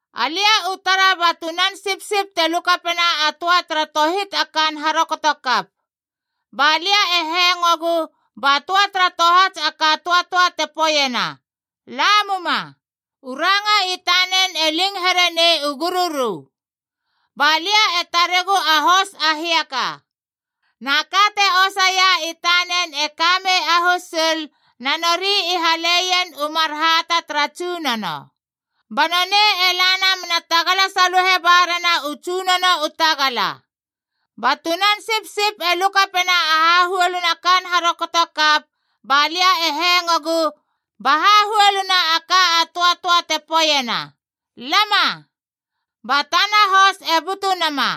Alia u tara ba Tunan Sipsip te lukapena a töa tara tohit a kaan harokotokap. Ba lia e hengogu ba töa tara tohats a ka a töatöa te poeiena, “Lamuma,” u ranga i tanen e ling herenei u gururu. Ba lia e taregu a hos a hiaka. Na ka te osaia i tanen e ka mei a husul, na nori i haleien u mar hata tara tsunono. Ba nonei e lana me na tagala saluhe ba rena u tsunono u tagala. Ba Tunan Sipsip e lukapena a hahuoluna kaan harokotokap, ba lia e hengogu ba hahuoluna a ka a töatöa te poeiena, Lama! Ba tana hos e butu nama,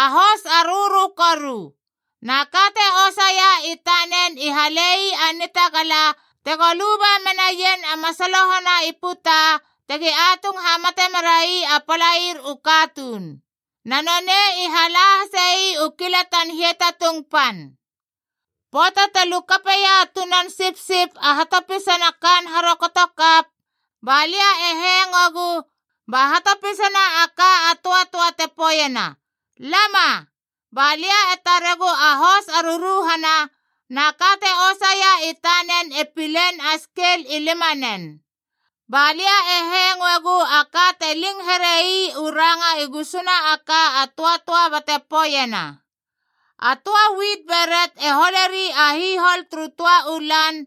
a hos a rörö koru. Na ka te osaia i tanen i hale ii a nitagala tego luba menaien a masaloho na i puta tegi atung hamate merai a palair u katuun. Na nonei i hala hase ii u kilatan hiatatung pan. Pöata te lukapeia a Tunan Sipsip a hatopisana kaan harokotokap, ba lia e hengogu ba hatopisana a ka a töatöa te poeiena, Lama! Ba lia e taregu a hos a ruruhana, na ka te osaia i tanen e pilein a skel i limanen. Ba lia e hengoegu a ka te ling here ii u ranga i gusuna a ka a töatöa bate poeiena, “A töa wit beret e holeri a hihol turu töa u lan,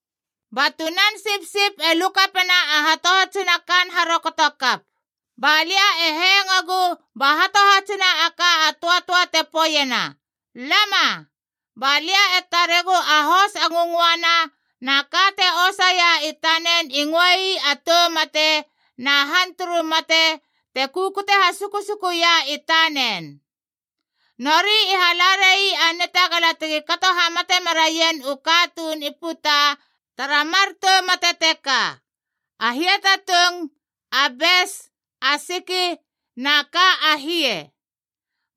Ba Tunan Sipsip e lukapena a hatohatsina kaan harokotokap, ba lia e hengogu ba hatohatsina a ka a töatöa te poeiena, Lama! Ba lia e taregu a hos a ngöngöana, na ka te osaia i tanen i ngöei a Tou Mate, na Han turu Mate te kukute hasukusukuia i tanen. Nori i hala rai a nitagala tegi kato hamate meraien u katuun i puta tara mar tou mate teka: a hiatatung, a bes, a siki, na ka a hie.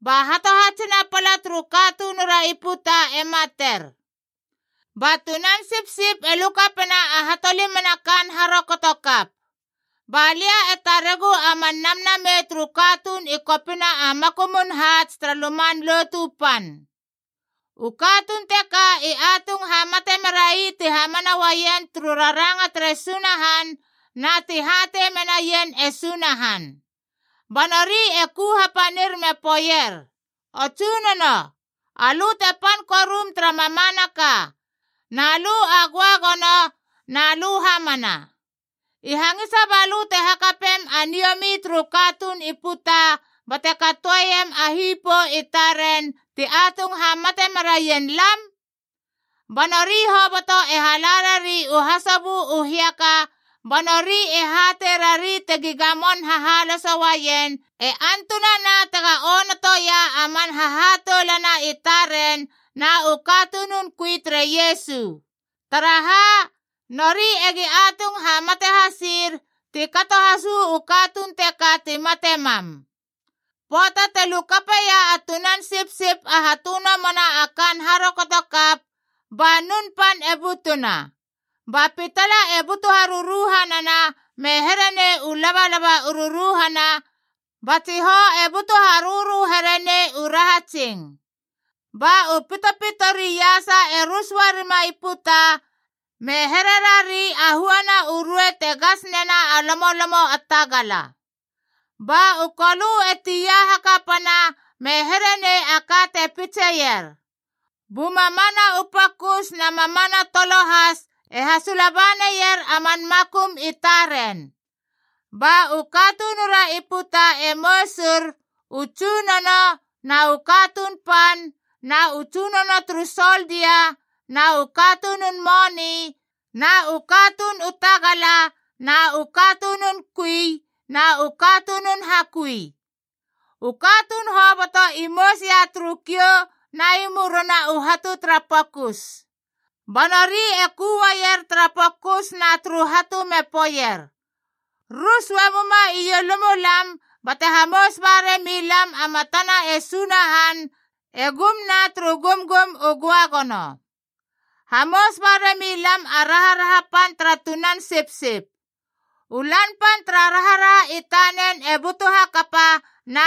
Ba hatohatsina pala turu katunura i puta e mater. Ba Tunan Sipsip e lukapena a hatolimana kaan harokotokap. Ba lia e taregu a man namnamei turu katuun i kopina a makumun haats tara Luman Lotu Pan. U katuun teka i atung hamate merai ti hamana uaien turu raranga tere Sunahan, na ti hatei menaien e Sunahan. Ba nori e ku hapanir me poeier, “O Tsunono, alö te pan korum tara mamanaka, na lö a göagono na lö hamana. I hangisa balö te hakapem a niomi turu katuun i puta bate katoeiem a hipou i taren ti atung hamate meraien lam?” Ba nori hoboto e hala rari u hasobö u hiaka, ba nori e hatei rari tegi gamon hahaloso uaien, e antunana tega onotoia a man hahatoulana i taren na u katunun kui tere Iesu. Taraha, nori egi atung hamate hasir, ti kato has uu katuun teka ti mate mam. Pöata te lukapeia a Tunan Sipsip a hatönomona a kaan harokotokap, ba nun pan e butuna, ba pitala e butu haruruhanana me here nei u labalaba u ruruhana, ba tsihou e butu harörö here nei u rahatsing. Ba u pitopito ri iasa e rus uarima i puta, me hererari a huana u ruei te gas nena a lomolomo a tagala. Ba u kolö e tia hakapana me here nei a ka te pitseier. Bu mamana u pokus na mamana tolo has e hasula ba naier a man makum i taren. Ba u katunura i puta e mousur, u tsunono, na u katuun pan, na u tsunono turu soldia, na u katunun moni, na u katuun u tagala, na u katunun kui, na u katunun hakui. U katuun hoboto i mousia turu kiou na i murina u hatu tara pokus. Ba nori e ku uaier tara pokus na turu hatu me poeier, “Rus uamuma ielumulam bate hamous ba rami lam a matana e Sunahan e gumna turu gumgum u göagono. Hamous barami lam a raharaha pan tara Tunan Sipsip. U Lan Pan tara raharaha i taren e butu hakapa,